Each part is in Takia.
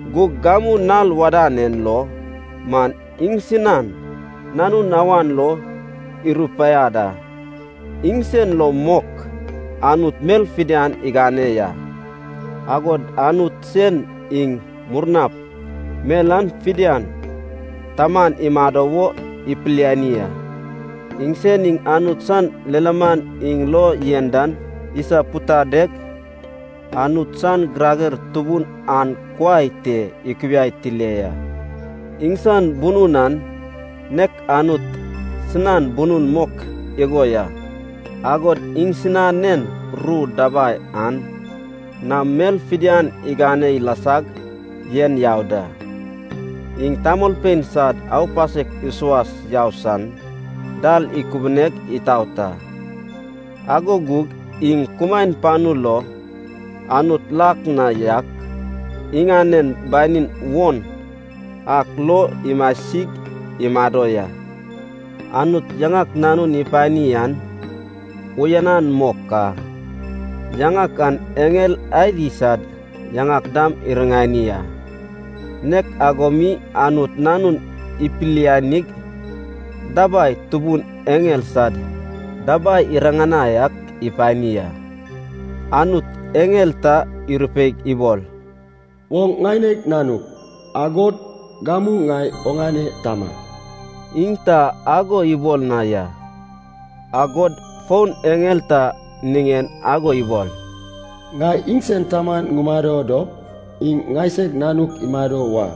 Gug gamu nal wadan en lo man iŋsinan Nanun awan lo irupaiad a. Iŋsen lo mok Anut mel fidian igane ya, agod Anut sen iŋ murnap mel an fidian taman imado wo ipiliani a. Iŋsen iŋ Anut san lilaman iŋ lo yen dan isapudadeg Anut san girager tubun an kuai te ikubiai tile ya. Iŋsan bunun an nek Anut sinan bunun mok igo ya. Agod iŋsinan ru dabai an nam mel fidian igane ilasag yen yau da. Iŋ tamolpein sad aupasek isuas yau san dal ikubuneg itout a, ago gug iŋ kumaen panu lo Anut lak na yak iŋanen banin won ak lo imasig imado ya. Anut yaŋak Nanun ipani an uyanan mok a. Yaŋak an eŋel adi sad yaŋak dam iriŋani a. Nek ago mi Anut Nanun ipilianig dabai tubun eŋel sad dabai iriŋanai ak ipani a. Anut eŋel ta irupeig ibol, “Oŋ ŋaineg nanug, agod gamu ŋai oŋane tama.” Iŋ ta ago ibol na ya. Agod fon eŋel ta niŋen ago ibol, “Ŋai iŋsan taman ŋumado dop iŋ ŋaisag nanuk imado wa.”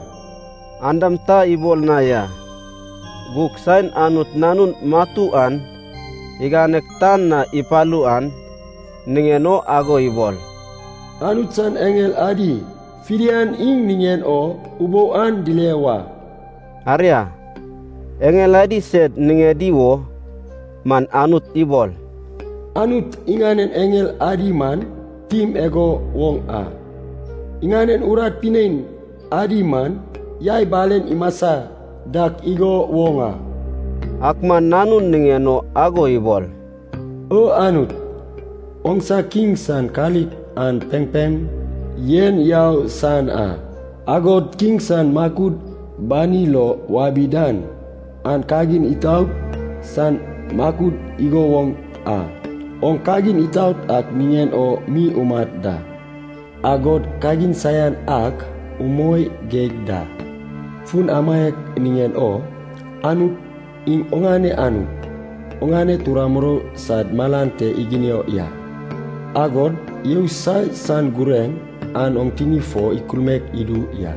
An dam ta ibol na ya. Gug saen Anut Nanun matu an iganeg tan na ipalu an niŋen o ago ibol, “Anut san eŋel adi fidian iŋ niŋen o ubou an dile wa.” Aria, eŋel adi sed niŋedi wo man Anut ibol, “Anut iŋanen eŋel adi man tim igo woŋ a, iŋanen urat pinein adi man yai balen imasa dak igo woŋ a.” Ak man Nanun niŋen o ago ibol, “O Anut, oŋsa Kiŋ san kalik an pempem yen yau san a. Agod Kiŋ san makud bani lo wabi dan an kagin itaot san makud igo woŋ a. Oŋ kagin itaot ak niŋen o mi umat da, agod kagin saian ak umoi geig da. Fun amaiak niŋen o Anut, iŋ oŋane Anut, oŋane tura murou sad malan te iginio ya, agod yousai san gureŋ an oŋ tini fo ikulmaek idu ya.”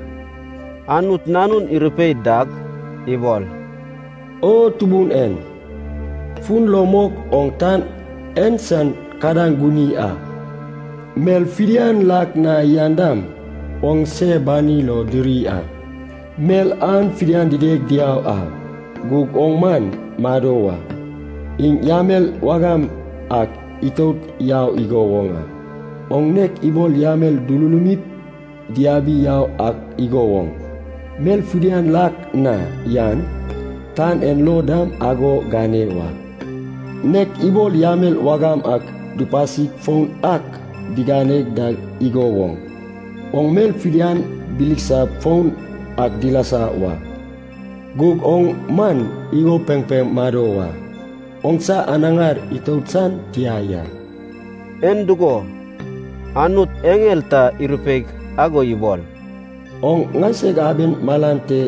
Anut Nanun irupei dag ibol, “O Tubun en, fun lo mok oŋ tan en san kadaŋ guni a, mel fidian lak na yan dam oŋse bani lo diri a. Mel an fidian dideg diau a, gug oŋ man mado wa, iŋ yamel wagam ak itout yau igo woŋ a. Oŋ nek ibol yamel dululumip diabi yau ak igo woŋ mel fidian lak na yan, tan en lo dam ago gane wa. Nek ibol yamel wagam ak dupasip foun ak digane dak igo woŋ, oŋ mel fidian bilisap foun ak dilasa wa. Gug oŋ man igo pempem mado wa, oŋsa anaŋar itout san tia ya.” En dugo, Anut eŋel ta irupeig ago ibol, “Oŋ ŋaisag aben malan te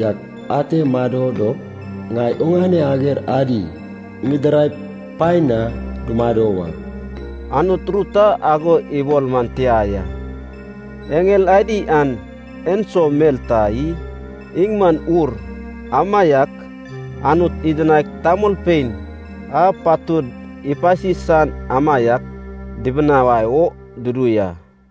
yak ate mado dop ŋai oŋane ager adi ŋidiraip paen na dumado wa,” Anut ru ta ago ibol man tia ya. Eŋel adi an enso mel ta i? Iŋ man ur, amaiak Anut idinaig tamolpein a patud ipasi san amaiak dibinawai o dudu ya.